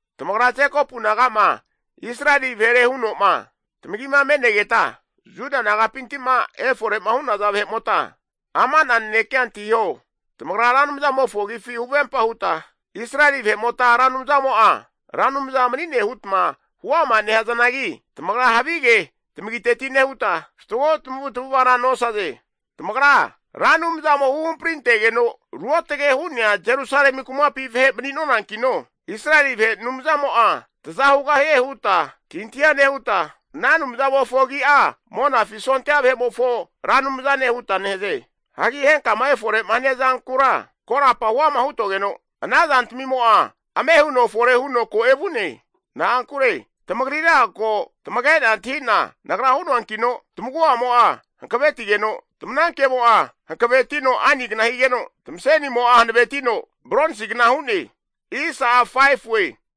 Tamagra Jekopu naga'ma Israeli vahere huno'ma tamagima me'negeta, Juda nagapinti'ma efore'ma hu'naza vahe'mota ama'na nanekea antahiho. Tamagra Ra Anumzamofo agifi huvempa huta Israeli vahe'mota Ra Anumzamo'a Ra Anumza mani'ne hutma huama nehazanagi, tamagra havige tamagiteti nehuta, fatgo tamavutamavara nosaze. Tamagra Ra Anumzamo huhamparintegeno ruotge hu'nea Jerusalemi kumapi vahe mani'nonankino, Israeli vahe Anumzamo'a taza hugahie huta antahintahia nehuta, ana Anumzamofo agi'a Monafi sondia vahe'mofo Ra Anumzane huta nehaze. Hagi henkama efore'ma hania zankura korapa huama hutogeno, ana zantamimo'a ame huno fore huno ko evu'ne. Na'ankure tamagrira ko tamage'na antahi'na Nagra hu'noankino tamagu'amo'a hankavetigeno, tamanankemo'a hankavetino ainigna higeno, tamasenimo'a hanavetino bronsigna hu'ne.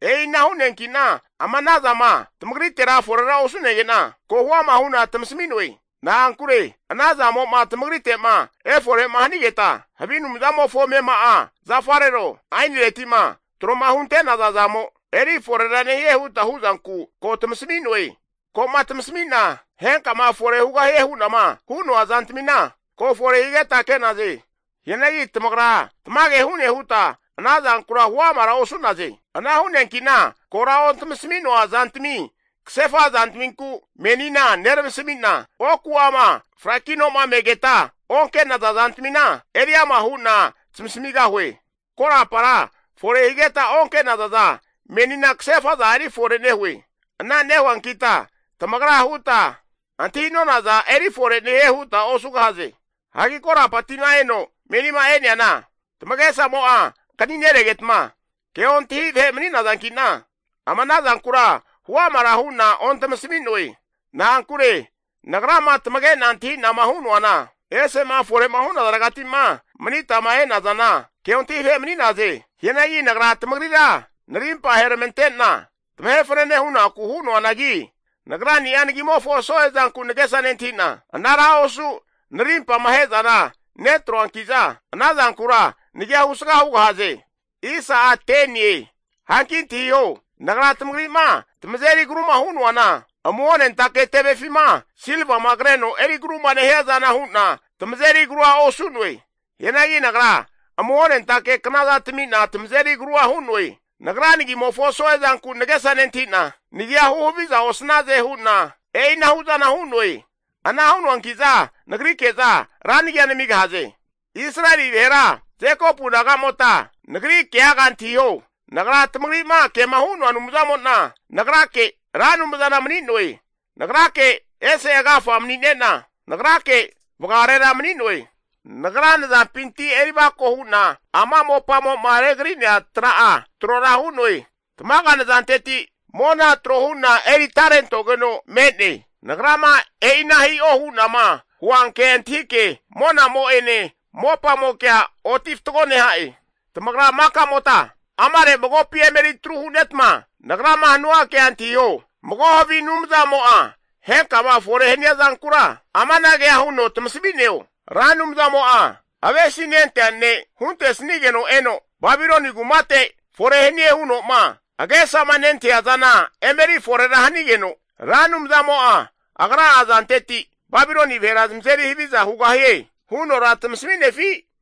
E'ina hu'neanki'na ama anazama tamagritera forera osu'nege'na, ko huama hu'na tamasami'noe. Na'ankure ana zamo'ma tamagrite'ma efore'ma hanigeta, havi anumzamofo amema'a zafarero, ainireti'ma tro'ma hunte'naza zamo eri forera nehie huta hu'zanku ko tamasami'noe. Ko'ma tamasami'na henkama fore hugahie hu'nama hu'noa zantamina ko fore higeta ke'naze. Hianagi tamagra tamage hu'ne huta ana zankura huamara osu'naze. Ana hu'neankina kora ontamasami'noa zantami kasefa zantaminku menina neramasamina, oku'ama frakinoma megeta onke'naza zantamina eri ama hu'na tamasamigahue. Korapara fore higeta onke'nazaza menina kasefa'za eri fore nehue. Ana nehuankita tamagra huta, antahi'nonaza eri fore nehie huta osugahaze. Hagi korapatima eno menima e'neana tamagesamo'a ankani renegetma ke ontahi vahe mani'nazanki'na, ama ana zankura huamara hu'na ontamasami'noe. Na'ankure Nagrama tamage'na antahi'nama hu'noana, esema fore'ma hunazaregatima manitama e'nazana keontahi vahe mani'naze. Hianagi Nagra tamagrira narimpa aheramante'na tamahe fanane hunaku hu'noanagi, Nagrani'a nagimofo so'e zanku nagesa nentahi'na anara osu narimpama ahe'zana netroankiza, ana zankura nagia husga hugahaze. Hanki antahiho, Nagra tamagri'ma tamazeri agruma hu'noana amuhonentake tevefima silvama kreno eri agruma nehiazana hu'na tamazeri agrua osu'noe. Hianagi nagra amuhonentake knaza tami'na tamazeri agrua hu'noe. Nagra nagimofo so'e zanku nagesa nentahi'na, nagia huhaviza osnaze hu'na e'inahu zana hu'noe. Ana hu'noanki'za nagrike'za ra nagia namigahaze. Israeli vahera Jekopu nagamota nagri keaga antahiho, nagra tamagri'ma kema hu'noa Anumzamo'na nagrake Ra Anumzana mani'noe. Nagrake ese agafa manine'na, nagrake vagarera mani'noe. Nagra nazampinti erivako hu'na ama mopamo'ma regri'nea tra'a trora hu'noe. Tamaga nazanteti mona tro hu'na eri atarentogeno me'ne. Nagrama e'ina hi'o hu'nama huanke antahike monamo'ene mopamokea oti fatgo neha'e. Tamagra maka'mota amare magopi emetru hu'netma nagrama hanua kea antahiho. Mago havi anumzamo'a henkama fore hania zankura amanagea huno tamasami'neo? Ra Anumzamo'a avesinentea ne' huntesnigeno eno, Babiloni kumate fore hanie huno'ma agesama nentahia zana emeri forera hanigeno, Ra Anumzamo'a Agra'a azanteti Babiloni vahera zamazeri haviza hugahie hunora tamasami'nefi?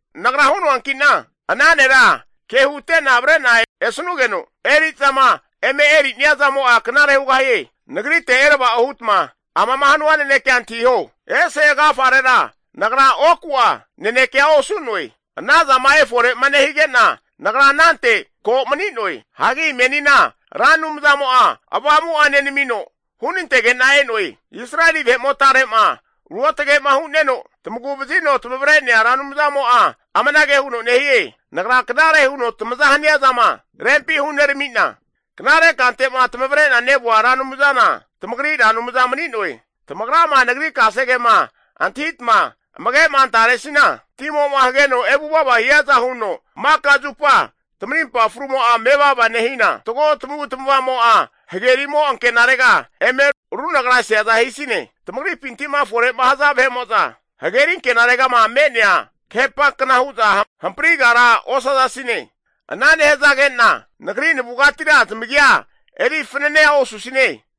Nagra hu'noankina, ana nera ke hute'na avre'na esanugeno eri'zama eme erinia zamo'a knare hugahie. Nagrite erava'o hutma amama hanua nanekea antahiho. Ese agafarera nagra oku'a nanekea osu'noe. Anazama efore'ma nehigena nagra anante ko mani'noe. Hagi menina Ra Anumzamo'a Avamu'a nenamino hunantege'na e'noe. Israeli vahe'motare'ma Ruotage'ma hu'neno, tamagu vazino tamavre'nea Ra Anumzamo'a amanage huno nehie. Nagra knare huno tamaza hania zama rempi hunerami'na, knare kante'ma tamavre'na nevua Ra Anumzana tamagri Ra Anumza mani'noe. Tamagrama Nagri kasegema antahitama amage'ma antaresina, timo'ma hageno evu'vava hiaza huno maka zupa tamarimpa frumo'a mevava nehina, fatgo tamavu tamava'mo'a, hagerimo ankenarega eme runagraseaza hisine. Tamagripinti'ma fore'ma haza vahe'mo'za, hageri ankenaregama me'nea kahepankna hu'za hamprigara osazasine. Ana nehazagena Nagri navugatira zamagia eri fananea osusine.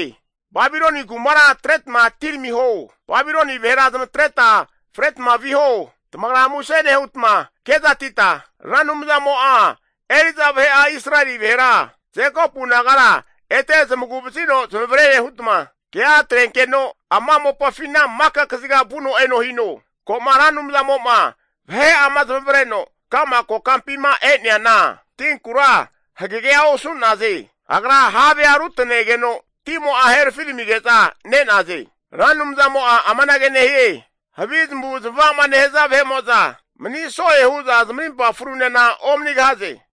Babiloni kumara atretma atiramiho, Babiloni vahera zamatreta fretma viho. Tamagra muse nehutma kezatita, Ra Anumzamo'a eri'za vahe'a Israeli vahera Jekopu nagara ete zamagu vazino zamavare hutma, kea atrenkeno ama mopafina maka kaziga vuno eno hino. Ko'ma Ra Anumzamo'ma vahe'ama zamavareno ka'ma kokampima e'neana, tinkura hagegea osu'naze. Agra havea rutanegeno timo'a herafiramige'za ne'naze. Ra Anumzamo'a amanage nehie, Havi zamavu zamava'ma nehaza vahe'mo'za mani so'e hu'za zamarimpa frunena omanigahaze.